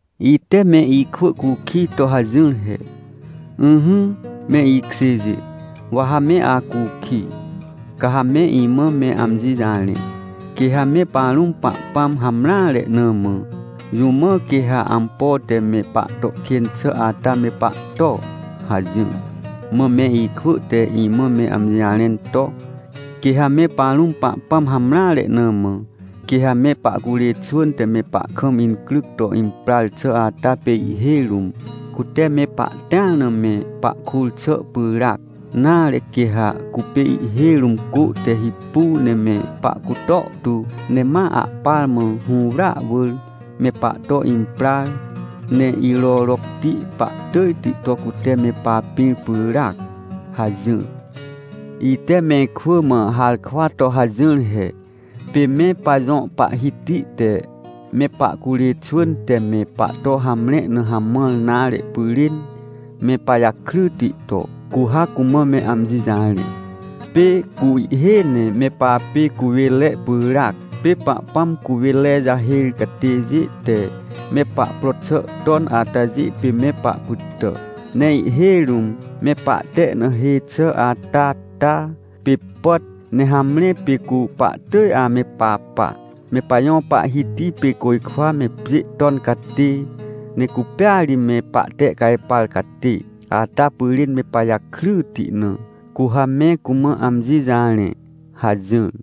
Ite me ikwỳ cukij to hajỹr he: “Ỹhỹ, me ikjêjê, wa ha me acukij, ca ha me imã me amji jarẽ. Quê ha me parũm Pahpãm hamreare na mã, jũ mã quê ha ampo te me pahto kên xà ata me pahto?” hajỹr. Mã me ikwỳ te imã me amji jarẽn to: “Quê ha me parũm Pahpãm hamreare na mã, quê ha me pahcurê xwỳn te me pahkam incryc to imprar xà ata pê ihhêj rũm, cute me pahtĩar na me pahkur xà pyràac. Nare, quê ha cupê ihhêj rũm cô te hipu ne me pahcutor tu, ne ma ahpar mã hũwrya wỳr me pahto imprar, ne irorocti pahtỳjti to cute me papĩr pyràac” hajỹr. Ite mehkwỳ mã harkwa to hajỹr he: “Pê me pajõ Pahhiti te me pahcurê xwỳn te me pahto hamre na hamãr nare pyrên me pajakryti to, cu ha cumã me amji jarẽ. Pê cu ihhêj ne me papê cuwênre pyràac. Pê Pahpãm cuwênre jahêr catêjê te me pahpro xà ton atajê pê me pahpytà. Ne ihhêj rũm me pahte na hê xà ata ta, pê pàt, ne hamre, pê cu pahtỳj ame papa. Me pajõ Pahhiti pê côjkwa me pjê ton catê, ne cupêa ri me pahtehcajpar catê ata pyrên me pajakryti na, cu ha me cumã amji jarẽ” hajỹr.